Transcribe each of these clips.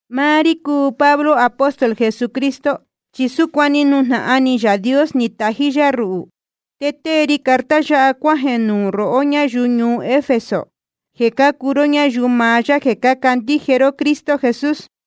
Máá rí cúu Pablo, apóstol Jesucristo, chi súcuan ni nujnahan ni Yaā Dios ni tají yá ruhū. Te tée ri carta yáha cuájeē nuū rohó ñáyuu ñuu Efeso, jeē cácuu ró ñáyuu maá yá jeē cácandíje ró Cristo Jesús.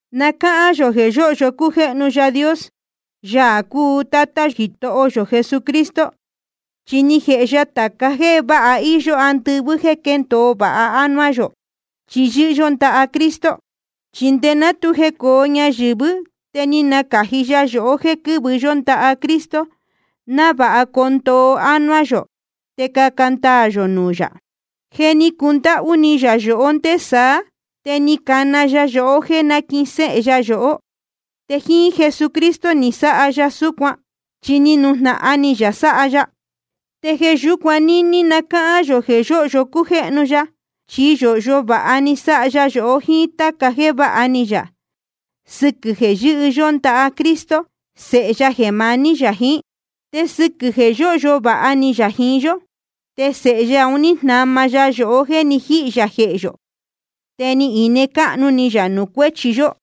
Na cáhán yō jeē yóhyo cújéhnu Yaā Dios, Yaā cúu Tátá Jitoho yō Jesucristo. Chi ni jēhe ya tāca jéē váha íyó andɨvɨ́ jéē quéndōo vāha ánuá yō, chi yɨ́hɨ yó ndaha Cristo. Chi nde ná tu jecōo ñayɨ̄vɨ́ te ni nacāji ya yohó jéē quɨ́vɨ yó ndaha Cristo, návāha coo ndoo ánuá yō te caca ndaā yō nuū yā. Je ni cundáhú ni yā yohó nde saá, te ni tana ya yohó jéē náquihin séhe ya yohó. Te jíín Jesucristo ni sáha ya súcuan, chi ni nujnahan ni yā sáha ya. Te jeē yúcuan níní na cáhán yō jeē yóhyo cújéhnu ya, chi yōhyo vāha ni sáha ya yohó jiín táca jéē váha ni yā, sɨquɨ̄ jeē yɨ́hɨ yó ndaha Cristo, Sēhe ya jeē maní yā jiín. Te sɨquɨ̄ jeē yóhyo vāha ni yā jiín yó, te Sēhe ya un ní jnama ya yohó jéē ni jíhī yā jehē yō, te ni ine cáhnu ni yā nuū cuéchi yó.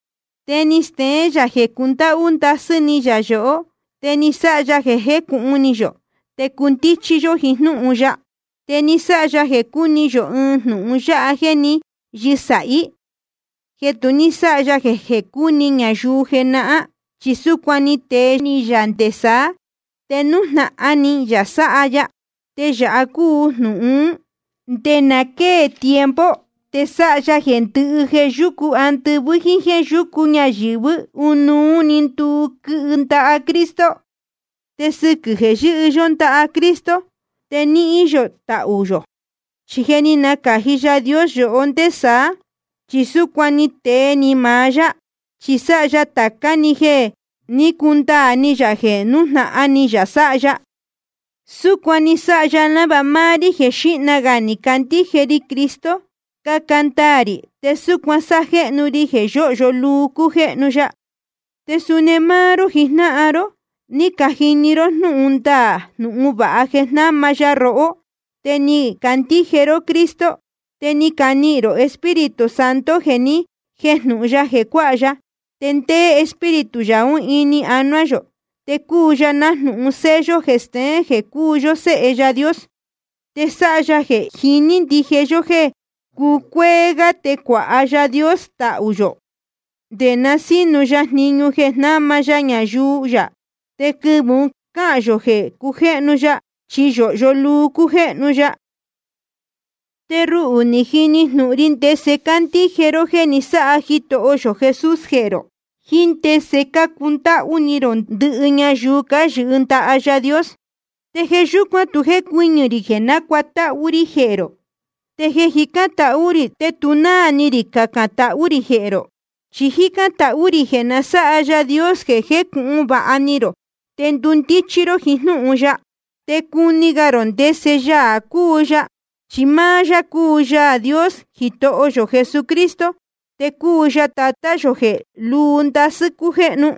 Te ni steén yā jeē cundáhú ndasɨ́ ni yā yohó, te ni sáha ya jeē jécūhun ni yō te cundíchí yó jiín jnúhun ya. Te ni sáha ya jeē cuni yō ɨɨn jnūhun ya jeē ní yɨsāhí, jeē tu ní sáha ya jeē cuni ñayuu jenahán. Chi súcuan ni tee ni yā nde saá, te nújnahan ni yā sáha ya. Te yāha cúu jnūhun ún: Nde na quée tiempo te sáha ya jeē ndɨhɨ jeē yúcu andɨvɨ́ jíín jéē yúcu ñayɨ̄vɨ́, ɨnuú‑ni nduu, quɨhɨ ndaha Cristo. Te sɨquɨ̄ jeē yɨ́hɨ yó ndaha Cristo, te nihīn yō tahū yō, chi je ni nacāji Yaā Dios yohó nde saá. Chi súcuan ni tee ni maá yá, chi sáha ya tācá‑ni jeē jé ni cundaā ni yā jeē nújnahan ni yā sáha ya. Súcuan ni sáha ya návāha máá rí jeē xíhna gā ni cacandíje ri Cristo, caca ndaā rī te súcuan sájéhnu ri yā jeē yōhyo luu cújéhnu ya. Te suni máá ró jijnáhan ró, ni cajini ró jnúhun ndaā jnūhun vāha jeē jnáma ya rohó, te ni cacandíje ró Cristo. Te ni canihīn rō Espíritu Santo jeē ni jéjnūhun ya jeē cuáha ya. Te ndéé Espíritu yā ún ini anuá yō, te cúu ya nájnūhun sello jeē steén jeē cúu yó séhe Yaā Dios. Te sáha ya jeē jiní ndije yó jéē cucuéé gá te cuāha Yaā Dios tahū yō, nde na sínu ya jniñu jeē jnáma ya ñayuu yā. Te quɨvɨ̄ ún cahān yō jeē cujéhnu ya, chi yōhyo luu cújéhnu ya. Te ruhū ni jini jnūhun ri ndese cácandíje ró jéē ni sáha Jitoho yō Jesús jehē rō, jíín ndese cácundáhú ni rō ndɨhɨ ñayuu cáyɨhɨ ndaha Yaā Dios. Te jeē yúcuan tu jécuɨñɨ̄ rī jeē nácuatáhú rí jehē rō, te jeē jicán tahú rī te tu náā ni rī cacān tahú rī jehē rō. Chi jícán tahú rī jeē na sáha Yaā Dios jeē jécūhun vāha ni rō te ndundíchí ró jiín jnúhun ya, te cuni gā rō ndese Yaā cúu ya. Chi máá yá cúu Yaā Dios Jitoho yō Jesucristo, te cúu ya Tatá yō jeē lúu ndasɨ́ cújéhnu.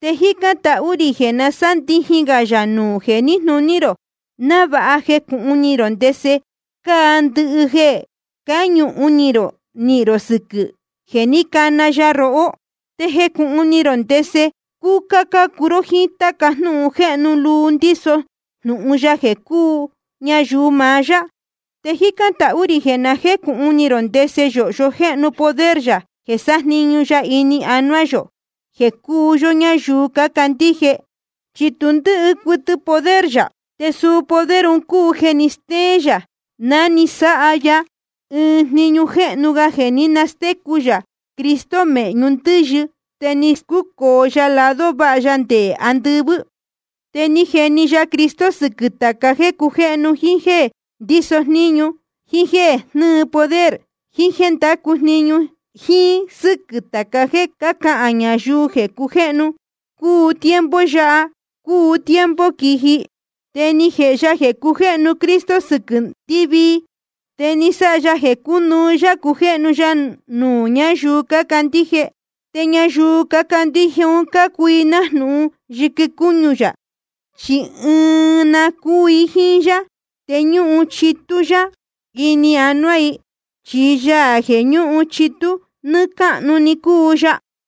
Te jícán tahú rī jeē na sándijin gā yā nuū jeē níjnūní rō, návāha jecūhun ni rō ndese cáa ndɨhɨ jeē cáñuhun ni rō nihīn rō sɨquɨ̄ jeē ní cana ya rohó. Te jecūhun ni rō ndese cúcá cácuu ró jíín táca jnúhun jéhnu luu ndíso jnūhun ya jeē cúu ñayuu maá yá. Te jícán tahú rī jeē na jécūhun ni rō ndese yōhyo jéhnu poder yā jeē sájniñu ya ini anuá yohó jéē cúu yó ñáyuu cácandíje. Chi tu ndɨ́hɨ cuɨtɨ poder yā. Te suu poder un cúu jeē ni stéén yā ná ni sáha ya ɨɨn jniñu jéhnu ga jeē ní nastécu yā Cristo mēhñu ndɨ́yɨ te ni scúcōo ya lado váha ya nde andɨvɨ́. Te ni jeni ya Cristo sɨquɨ̄ tāca jéē cujéhnu, jíín jéē ndíso jníñu, jíín jéē jnɨ́ɨ poder, jíín jéē ndácu jniñu, jíín sɨ́quɨ̄ táca jeē cácahān ñayuu jeē cujéhnu, cúu tiempo yáha, cúu tiempo quiji. Te ni jēhe ya jeē cujéhnu Cristo sɨquɨ̄ ndɨvii. Te ni sáha ya jeē cúnuú yá cujéhnu ya nuū ñáyuu cácandíje. Te ñayuu cácandíje un cácuu i nájnūhun yɨquɨ cúñu ya, chi ɨɨn na cúu i jíín yá te ñúhun chitú yá ini anuá i, chi Yaā jeē ñúhun chitú nɨ́ɨ́ cáhnu‑ni cúu ya.